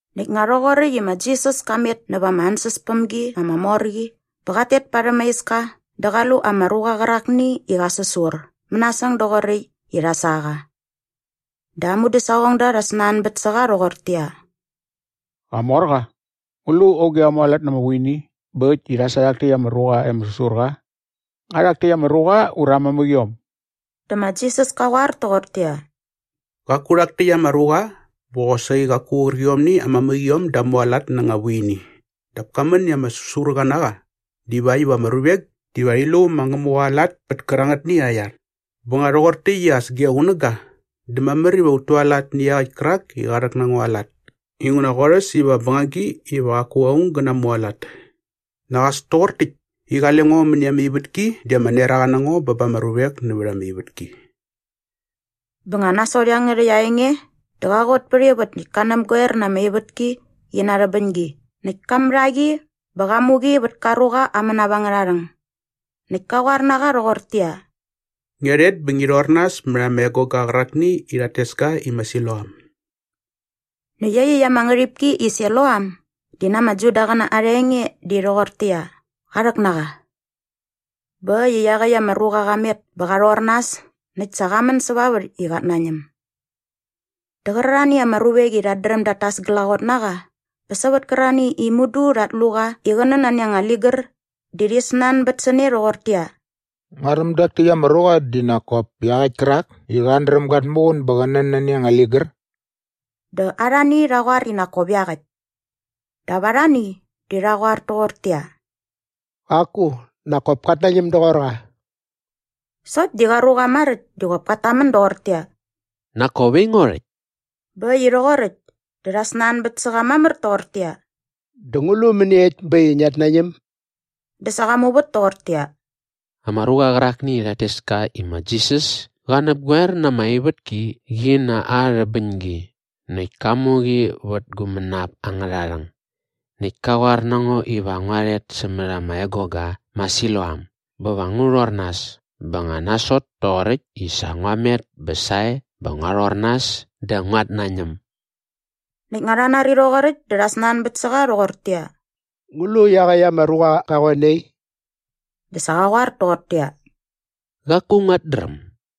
Näkt nga rhoqoräkt i ma Jisas ka met näva ama ansäspämgi ama mor qi bä qat tet parhäm aa iska dä qa lu ama ruqa qärakni i qa säsur mänasäng doqoräkt i rha sa qa. Dä aa mudäsaqongda rha snanbät sä qa rhoqortäqyia, “Qamorqa, ngu lu auge qa mualat na ama vuini bä äkt i rha sa rhak täkt ama ruqa i ama säsur qa? Nga rhak täkt ama ruqa ura aa mamäqiom?” Dä ma Jisas ka qoar toqortäqyia, “Qaku rhak täkt ama ruqa bä qosaqi qaku qärqiomni aa mamäqiom da mualat na anga vuini dap ka män i ama säsurqa na qa divakt iva ama ruvek diva rhi lu ma Ngämuqa aa lat pät kärangätni aa iar. Bä nga rhoqor täkt i as ge qunäga dä mamär iva ut tualat nä iaqäkt kärak i qa rhäk na ngo aa lat inguna qorhäs iva bängagi iva qaku aung gä namualat. Näkt as toqor täkt i qale ngo mäni ama ivätki di ama neraqa na ngo bä ba ama ruvek nävät ama ivätki.” Bä nga nasot iangärhäkt aa enge dä qa qot pät ivät näkt ka näpgoer na ama ivätki qi na aa rhäbäñgi näkt ka mat a qi bä qa mu qi vät ka ruqa aa mänap angärha rhäng. Näkt ka qoar na qa rhoqortäqyia, “Ngia rhet bä ngi rhor nas mät ama egoga qärakni i rhat tes ka i ma Siloam.” Näkt iaqyäkt ama ngärhipki i Siloam di na ama Judaqäna arha enge di rhoqortäqyia, qa rhäk na qa. Bä äkt i iaqäkt ama ruqa qa met bä qa rhor nas näkt sa qa män säva vät i qat nañäm. Dä qärarhani ama ruvek i rhat dräm dat tas glaqot na qa bä sävät kärarhani i mudu rhat lu qa i qä nän nani anga ligär di rhi snanbät sä ne rhoqortäqyia, “Nguaräm dak täkt ama ruqa di nak kop iaqäkt kärak i qat dräm gat muqun bä qä nän nani anga ligär.” Dä arhani rha qoar i nak kop iaqäkt. Dap arhani di rha qoar toqortäqyia, “Qaku, nak kop kat nañäm doqor qa.” Sokt di qa ruqa maräkt di qop kat tamän doqortäqyia, “Nak kop aingo rhäkt.” Bä äkt i rhoqoräkt dä rha snanbät sä qa mamär toqortäqyia, “Dä ngu lu mäniekt bä äkt i ngiat nañäm?” Dä sa qa muvät toqortäqyia, “Ama ruqa qärakni i rhat tes ka i ma Jisas ka näpgoer na ama ivätki qi na aa rhäbäñgi näkt ka mu qi vät gu mänap angärha rhäng. Näkt ka qoar na ngo iva ngua rhet sämät ama egoga ma Siloam bä va ngu rhor nas. Bä nga nasot toqoräkt i sa ngua met bä sae bä ngua rhor nas dä nguat nañäm.” Näkt nga rha nari rhoqoräkt dä rha snanbät sä qa rhoqortäqyia, “Ngu lu iaqäkt ama ruqa qa qoe nai?” Dä sa qa qoar toqortäqyia, “Qaku nguat dräm.”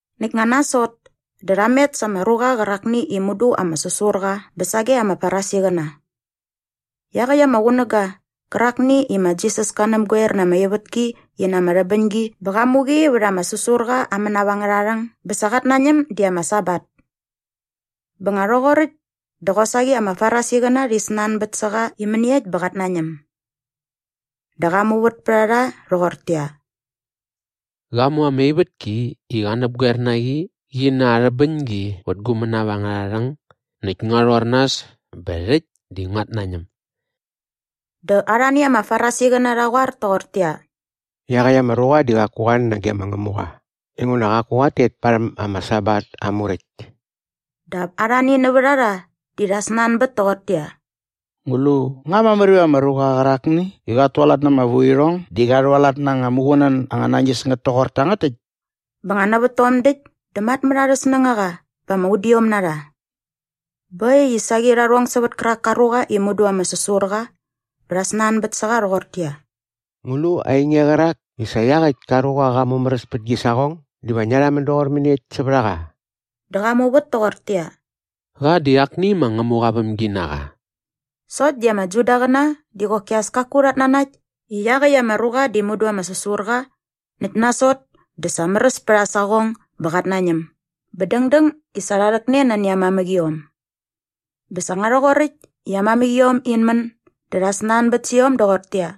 Näkt nga nasot dä rha met sa ama ruqa qärakni i mudu ama säsur qa bä sage ama Farisiqäna. Iaqäkt ama qunäga qärakni i ma Jisas ka näpgoer na ama ivätki qi na aa rhäbäñgi bä qa mu qi vät ama säsurqa aa mänap angärha rhäng bä sa qat nañäm di ama Sabat. Bä nga rhoqoräkt dä qosaqi ama Farisiqäna rhi snanbät sä qa i mäniekt bä qat nañäm. Dä qa muvät pät a rha rhoqortäqyia, “Qa mu ama ivätki i qa näpgoer na qi qi na aa rhäbäñgi vät gu mänap angärha rhäng näkt ngua rhor nas bä rhäkt di nguat nañäm.” Dä arhani ama Farisiqäna rha qoar toqortäqyia, “Iaqäkt ama ruqa di qaku qa nage ma Ngämuqa inguna qaku qat tet parhäm ama Sabat aa muräkt.” Dap arhani nävät a rha di rha snanbät toqortäqyia, “Ngu lu nga mamär iva anga ruqa qärakni i qat tualat na ama vuirhong di qa rhualat na anga muqunän anga nañis ngät toqor tangät täkt?” Bä nga nävät tom däkt dä matmät arhä snängaqa bä ama udiom na rha. Bä äkt i saqi rha rhong sävät kärak ka ruqa i mudu ama säsur qa bä rha snanbät sä qa rhoqortäqyia, “Ngu lu ainge qärak i sa iaqäkt ka ruqa qa mumäräs pät gi saqong diva ngia rhamän doqor mäniekt sävät a qa?” Dä qa muvät toqortäqyia, “Qa di akni ma Ngämuqa aa vämginaqa.” Sokt di ama Judaqäna di qoki as kaku rhat nanakt i iaqäkt ama ruqa di mudu ama säsur qa näkt nasot dä sa märäs pät aa saqong bä qat nañäm bä dängdäng i sa rha rhäkne nani aa mamäqiom. Bä sa nga rhoqoräkt i aa mamäqiom in män dä rha snanbät sä iom doqortäqyia,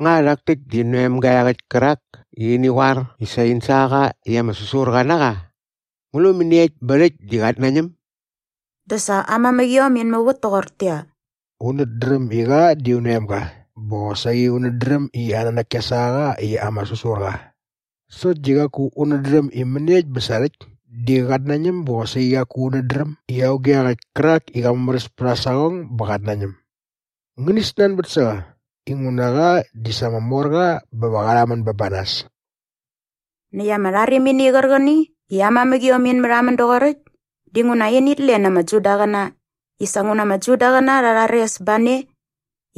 “Nga rhak täkt di in oemga iaqäkt kärak i ini qoar i sa in sa qa i ama säsurqa na qa? Ngu lu mäniekt bä rhäkt di qat nañäm?” Dä sa aa mamäqiom in muvät toqortäqyia, “Unät dräm i qa di un oemga bä qosaqi unät dräm i aa nanäk kia sa qa i ama säsur qa. Sokt di qaku unät dräm i mäniekt bä sa rhäkt di qat nañäm bä qosaqi qaku unät dräm i auge iaqäkt kärak i qa mumäräs pät aa saqong bä qat nañäm. Ngäni snanbät sä qa inguna qa di sa ama mor qa bä va qa rhamän bä ba nas.” Näkt ama rharimini qärqäni i aa mamäqiom in märhamän doqoräkt dinguna init len ama Judaqäna i sa nguna ama Judaqäna rha rhares ba ne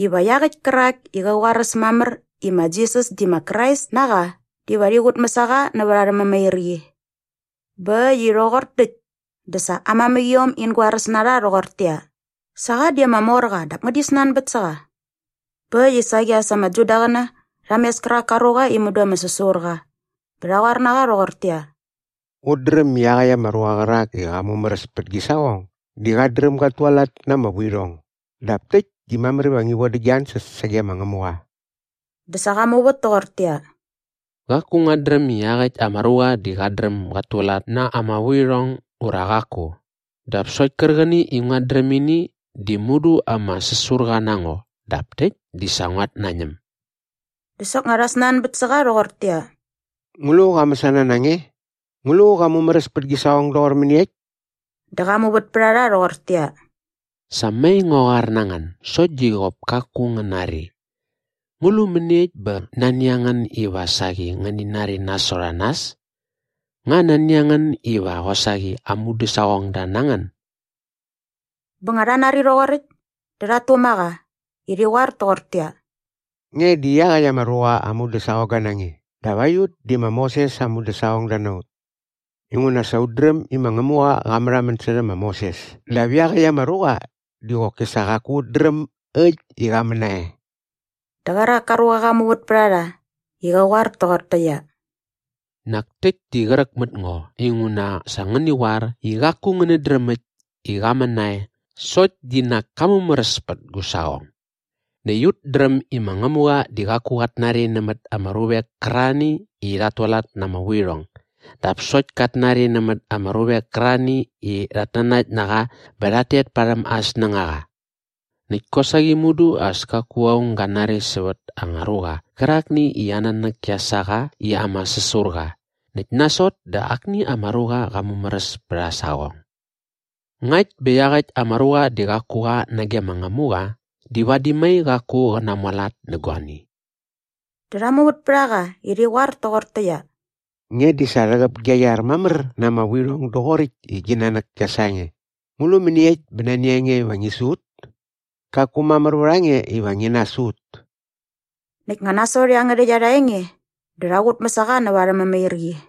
iva iaqäkt kärak i qä qoaräs mamär i ma Jisas di ma Krais na qa diva rhi qutmäs a qa näva arhä mämairqi. Bä äkt i rhoqor täkt dä sa aa mamäqiom in goaräs na rha rhoqortäqyia, “Sa qa di ama mor qa dap ngäni snanbät sä qa.” Bä äkt i saqi as ama Judaqäna rha mes kärak ka ruqa i mudu ama säsur qa bä rha qoar na qa rhoqortäqyia, “Ut dräm i iaqäkt ama ruqa qärak i qa mumäräs pät gi saqong di qat dräm gat tualat na ama vuirhong. Dap täkt di mamär iva ngi vodä gia ansäs sage ma Ngämuqa.” Dä sa qa muvät toqortäqyia, “Qaku nguat dräm i iaqäkt ama ruqa di qat dräm gat tualat na ama vuirhong ura qaku. Dap sokt kärqäni i nguat dräm ini di mudu ama säsurqa na ngo dap täkt di sa nguat nañäm.” Dä soknga rha snanbät sä qa rhoqortäqyia, “Ngu lu qa mäsana na nge? Ngu lu qa mumäräs pät gi saqong doqor mäniekt?” Dä qa muvät pät a rha rhoqortäqyia, “Sa mai ngua qoar na ngän sokt di qop kaku ngän nari. Ngu lu mäniekt bä nani a ngän iva saqi ngäni nari nasot a nas? Nga nani a ngän iva qosaqi aa mudäsaqongda na ngän?” Bä nga rha nari rhoqoräkt dä rhat tuma qa i rhi qoar toqortäqyia, “Nge di iaqäkt ama ruqa aa mudäsaqongga na nge dap aiut di ma Moses aa mudäsaqongda na ut! Inguna sa ut dräm i ma Ngämuqa qa märhamän särhä ma Moses dap iaqäkt ama ruqa di qoki sa qaku ut dräm äkt i qa män nae.” Dä qärak ka ruqa qa muvät pät a rha i qä qoar toqortäqyia, “Nak täkt di qräk mät ngo inguna sa ngäni qoar i qaku ngänät dräm äkt i qa män nae sokt di nak ka mumäräs pät gu saqong! Näkt ut dräm i ma Ngämuqa di qaku qat nari nämät ama ruvek kärarhani i rhat tualat na ama vuirhong. Dap sokt kat nari nämät ama ruvek kärarhani i rhat nanakt na qa bä rhat tet parhäm aa snängaqa. Näkt kosaqi mudu as kaku aung ga nari sävät anga ruqa qärakni i aa nanäk kia sa qa i ama säsur qa näkt nasot dä akni ama ruqa qa mumäräs pät aa saqong. Ngakt bä iaqäkt ama ruqa di qaku qa nage ma Ngämuqa di vadi mai qaku qä namualat nä guani.” Dä rha muvät pät a qa i rhi qoar toqortäqyia, “Nge di sa rhäqäp gia iar mamär na ama vuirhong doqoräkt i gi nanäk kia sa nge. Ngu lu mäniekt bä nani a nge iva ngi su ut? Qaku mamär vät a nge iva ngi nasu ut.” Näkt nga nasot iangärhäkt arha enge dä rha qutmäs a qa näva arhä mämairqi.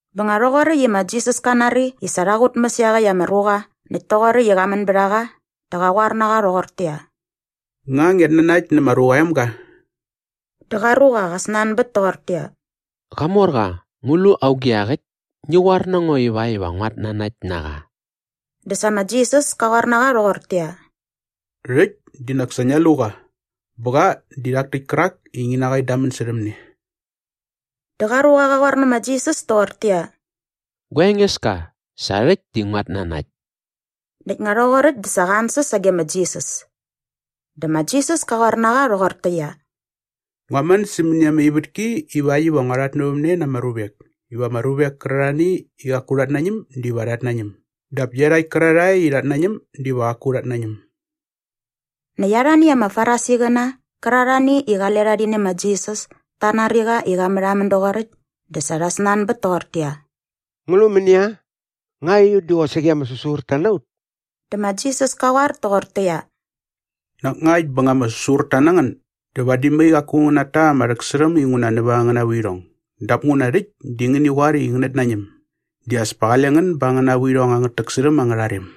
Bä nga rhoqoräkt i ma Jisas ka nari i sa rha qutmäs iaqäkt ama ruqa näkt toqoräkt i qa män bät a qa dä qa qoar na qa rhoqortäqyia, “Nga ngiat nanakt nä ma Ruqa aa Emga?” Dä qa ruqa qa snanbät toqortäqyia, “Qamorqa, ngu lu auge iaqäkt? Ngi qoar na ngo ivakt iva nguat nanakt na qa.” Dä sa ma Jisas ka qoar na qa rhoqortäqyia, “Rhäkt di nak sa ngia lu qa bä qa di rhak täkt kärak i ngi na qa in damän särhäm ne.” Dä qa ruqa qa qoar nä ma Jisas toqortäqyia, “Gua Engeska, sa rhäkt di nguat nanakt.” Näkt nga rhoqoräkt dä sa qa ansäs sage ma Jisas. Dä ma Jisas ka qoar na qa rhoqortäqyia, “Ngua män sämäni ama ivätki ivakt iva ngua rhatnävämne na ama ruvek iva ama ruvek kärarhani i qaku rhat nañäm diva rhat nañäm dap iarhakt kärarhae i rhat nañäm diva qaku rhat nañäm.” Näkt arhani ama Farisiqäna qärarhani i qale rha rhi nä ma Jisas ta nari qa i qa märhamän doqoräkt dä sa rha snanbät toqortäqyia, “Ngu lu mänia? Nga aiut di qosaqi ama säsurta na ut?” Dä ma Jisas ka qoar toqortäqyia, “Nak ngakt bä nga ama säsurta na ngän dä vadi mai qaku ngän nata ama rhäksärhäm inguna nävät angäna vuirhong dap nguna rhäkt di ngäni qoar i ngänät nañäm di as pa qale ngän ba angäna vuirhong angät täksärhäm angärha rem.”